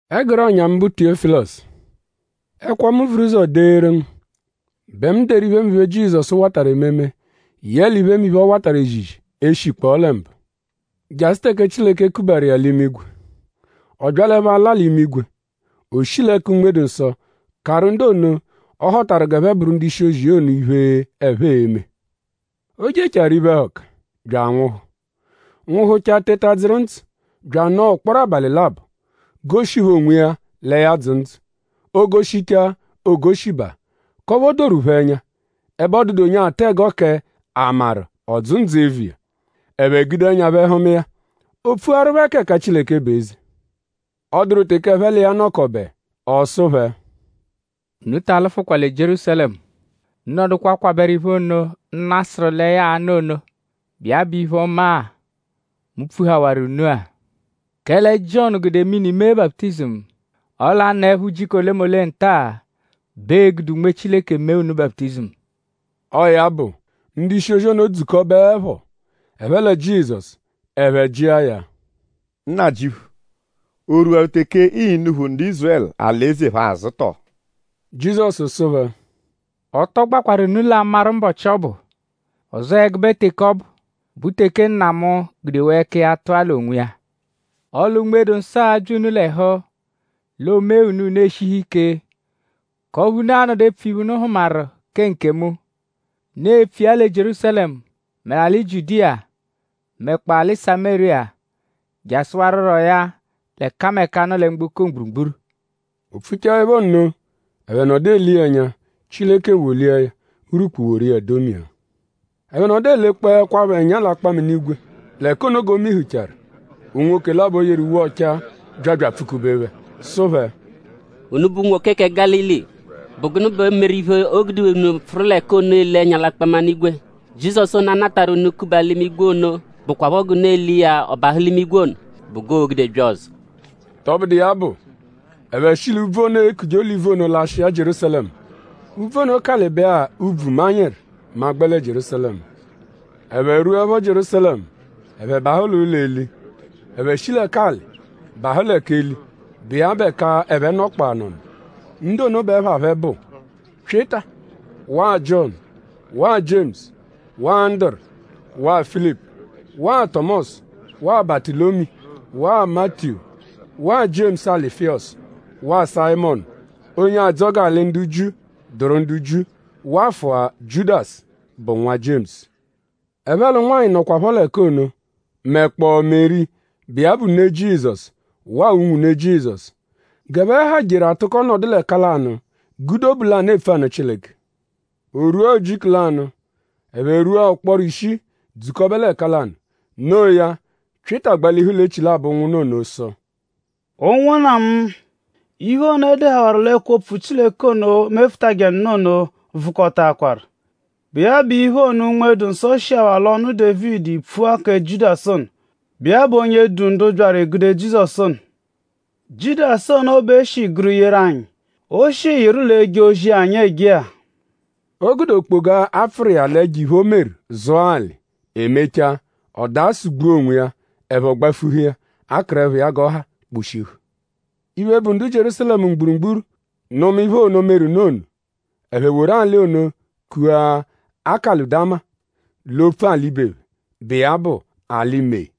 Ẹguru ọ̀nyà mu, bụ Tiyọ́filosu: Ẹkwo, mu vuru ụzo deeru ngu bẹ mu deru iphemiphe, Jizọsu watarụ ememe yẹle iphemiphe, ọ watarụ ezizi e -shikpọo lẹ mbụ; jasụ teke Chileke kubaru iya l'imigwe. Ọ byalẹpho ala l'imigwe; o shi l'ẹka Unme-dụ-Nsọ karụ ndu ono, ọ họtaru g'ẹphe bụru ndu-ishi-ozi iya ono iphe, ẹphe e-me. O jechaaru iphe-ẹhuka; bya anwụhu; nwụhuchaa teta dzụru ndzụ; bya anọo ụkporo abalị labọ; goshi phẹ onwiya lẹ ya dzụ ndzụ. O -goshichaa; o -goshibaa k'ọphu o doru phẹ ẹnya; ẹbe ọ dụdu onye atụ ẹgo kẹ?a maru ọ dzụ ndzụ eviya? Ẹphe gude ẹnya phẹ hụma iya. O pfuaru phẹ k'ẹka Chileke bụ eze. Ọ dụru teke ẹphe l'iya nọkobe; ọ sụ phẹ: “Unu ta alụfukwa lẹ Jierúsalẹmu. Unu nọdukwa kwabẹru iphe ono, Nna sụru lẹ ya a-nụ ono, bụ iya bụ iphe-ọma-a, mu pfuhawaru unu-a. Kẹle Jiọnu gude mini mee baputizimu; ọle a -nọepho ujiku olemole nta-a bẹ ee-gude Unme Chileke mee unu baputizimu.” Ọo ya bụ; ndu-ishi-ozi ono dzukọbeepho; ẹphe lẹ Jizọsu; ẹphe jịa ya: “Nnajịuphu;?o rwuwaru teke ịi-nuphu ndu Ízurẹlu alị-eze phẹ azụ tọ?” Jizọsu sụ phẹ: “Ọ tọ gbakwarụ unu l'amarụ mbọchi, ọ bụ; ọzoo ẹgube teke ọ bụ, bụ teke Nna mu gudewaa ẹka iya tụa l'onwiya. Ọle Unme-dụ-Nsọ a-bya unu l'ẹhu; l'o mee unu; unu eshihu ike; k'ọphu unu a-nọdu epfu iphe, unu hụmaru kẹ nkemu. Unu e-pfu iya lẹ Jierúsalẹmu; mẹ alị Jiudiya; mẹkpoo alị Samériya jasụwaruroya l'ẹkameka, nọ lẹ mgboko mgburugburu.” O pfuchaẹpho nno; ẹphe nọdu ele iya ẹnya; Chileke wolia ya. Urwukpu woru iya domia. Ẹphe nọdu elekpọekwapho ẹnya l'akpaminigwe l'ẹka ono g'o mihuchaaru. Unwoke labọ, yeru uwe ọchaa bya bya apfụ-kube phẹ; sụ phẹ: “Unubẹ unwoke kẹ Gálili;?bụ gụnu bẹ meru iphe, o gude unu pfụru l'ẹka ono ele ẹnya l'akpaminigwe? Jizọsu ono, a natarụ unu kuba l'imigwe ono bụkwapho g'unu ele iya ọ bahụ l'imigwe ono bụ g'oo-gude bya ọzo.” Tọbudu iya bụ; ẹphe shi l'úbvú ono, eekuje Olivu ono lashịa Jierúsalẹmu. Úbvú ono kalịbe-a ubvu manyịru mẹ a -gbẹ lẹ Jierúsalẹmu. Ẹphe rwuẹpho Jierúsalẹmu; ẹphe bahụ l'ụlo eli. Ẹphe shi lẹ k'alị bahụ lẹ k'eli, bụ iya bụ ẹka ẹphe nọkpoo anọno. Ndu ono bẹ ẹpha phẹ bụ: Pyịta waa Jiọnu waa Jiemusu waa Anduru waa Filipu waa Tọmosu waa Batụlomiyu waa Matiyu waa Jiemusu Alufiyọsu waa Sayịmonu, onye adzọ g'alị ndu Jiu dụru ndu Jiu wafụa Jiudasu bụ nwa Jiemusu. Ẹphe l'ụnwanyi nọkwapho l'ẹka ono; mẹkpoo Meri, bụ iya bụ ne Jizọsu waa unwune Jizọsu. G'ẹphe ha jeru atụko nọdu l'ẹka lanụ gude obu lanụ epfu anụ Chileke. O rwua ujiku lanụ; ẹphe rwua ụkporo ishii dzukọbe l'ẹka lanụ. Noo ya; Pyịta gbalihu l'echilabọ ụnwunna ono sụ: “Ụnwunna mu; iphe ono, e dehawaru l'ẹkwo-opfu Chileke ono, mefụtaje nụ ono vụkotaakwaru, bụ iya bụ iphe ono, Unme-dụ-Nsọ shihawaa l'ọnu Dévidi pfua kẹ Jiudasu ono, bụ iya bụ onye du ndu byaru egude Jizọsu ono. Jiudasu ono bẹ e shi gụru yeru anyi; o shi yịru l'eje ozi-a, anyi eje-a.” O gude okpoga, a pfụru iya l'ẹjo-iphe, o meru zụa alị; e mechaa ọ daa sụ-gbua onwiya; ẹpho gbafuhu iya; akụrepho iya g'ọ ha kposhihu. Iphe, bụ ndu Jierúsalẹmu mgburugburu nụma iphe ono, meru nụ ono. Ẹphe woru alị ono kua Akeludama l'opfu ibe phẹ, bụ iya bụ “Alị mee.”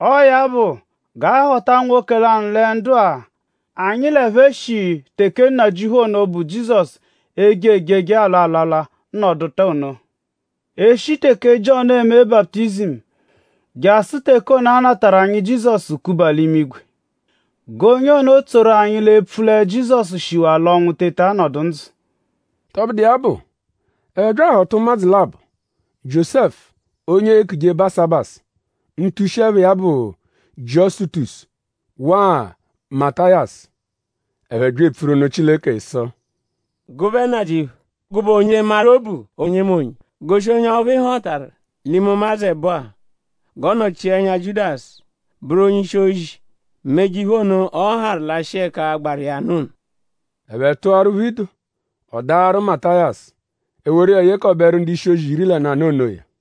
“Ọo ya bụ g'a họta nwoke lanụ lẹ ndu-a, anyi l'ẹphe shi teke Nnajịuphu ono, bụ Jizọsu eje ejeje alwa alwalwa nọduta ono; e -shi teke Jiọnu eme baputizimu jasụ teke ono a natarụ anyi Jizọsu kuba l'imigwe. G'onye ono tsoru anyi l'epfu lẹ Jizọsu shiwaa l'ọnwu teta nọdu ndzụ.” Tọbudu iya bụ; ẹphe bya ahọta ụmadzu labọ; Jiósẹfu onye eekuje Basabasu, ntushi-ẹpha iya bụ Jiọsutosu; waa Matayasu. Ẹphe bya epfuru nụ Chileke sụ: “Gụbe Nnajịuphu; gụbe onye maru obu onyemonye; goshi onye ọphu ị họtaru l'ime ụmadzu ẹbo-a; g'ọ nọchia ẹnya Jiudasu bụru onye-ishi-ozi; meje iphe ono, ọ harụ lashịa ẹka gbaru iya nụ ono.” Ẹphe tụaru phẹ ido. Ọ daaru Matayasu. E woru iya yekọberu ndu-ishi-ozi iri lẹ nanụ onoya.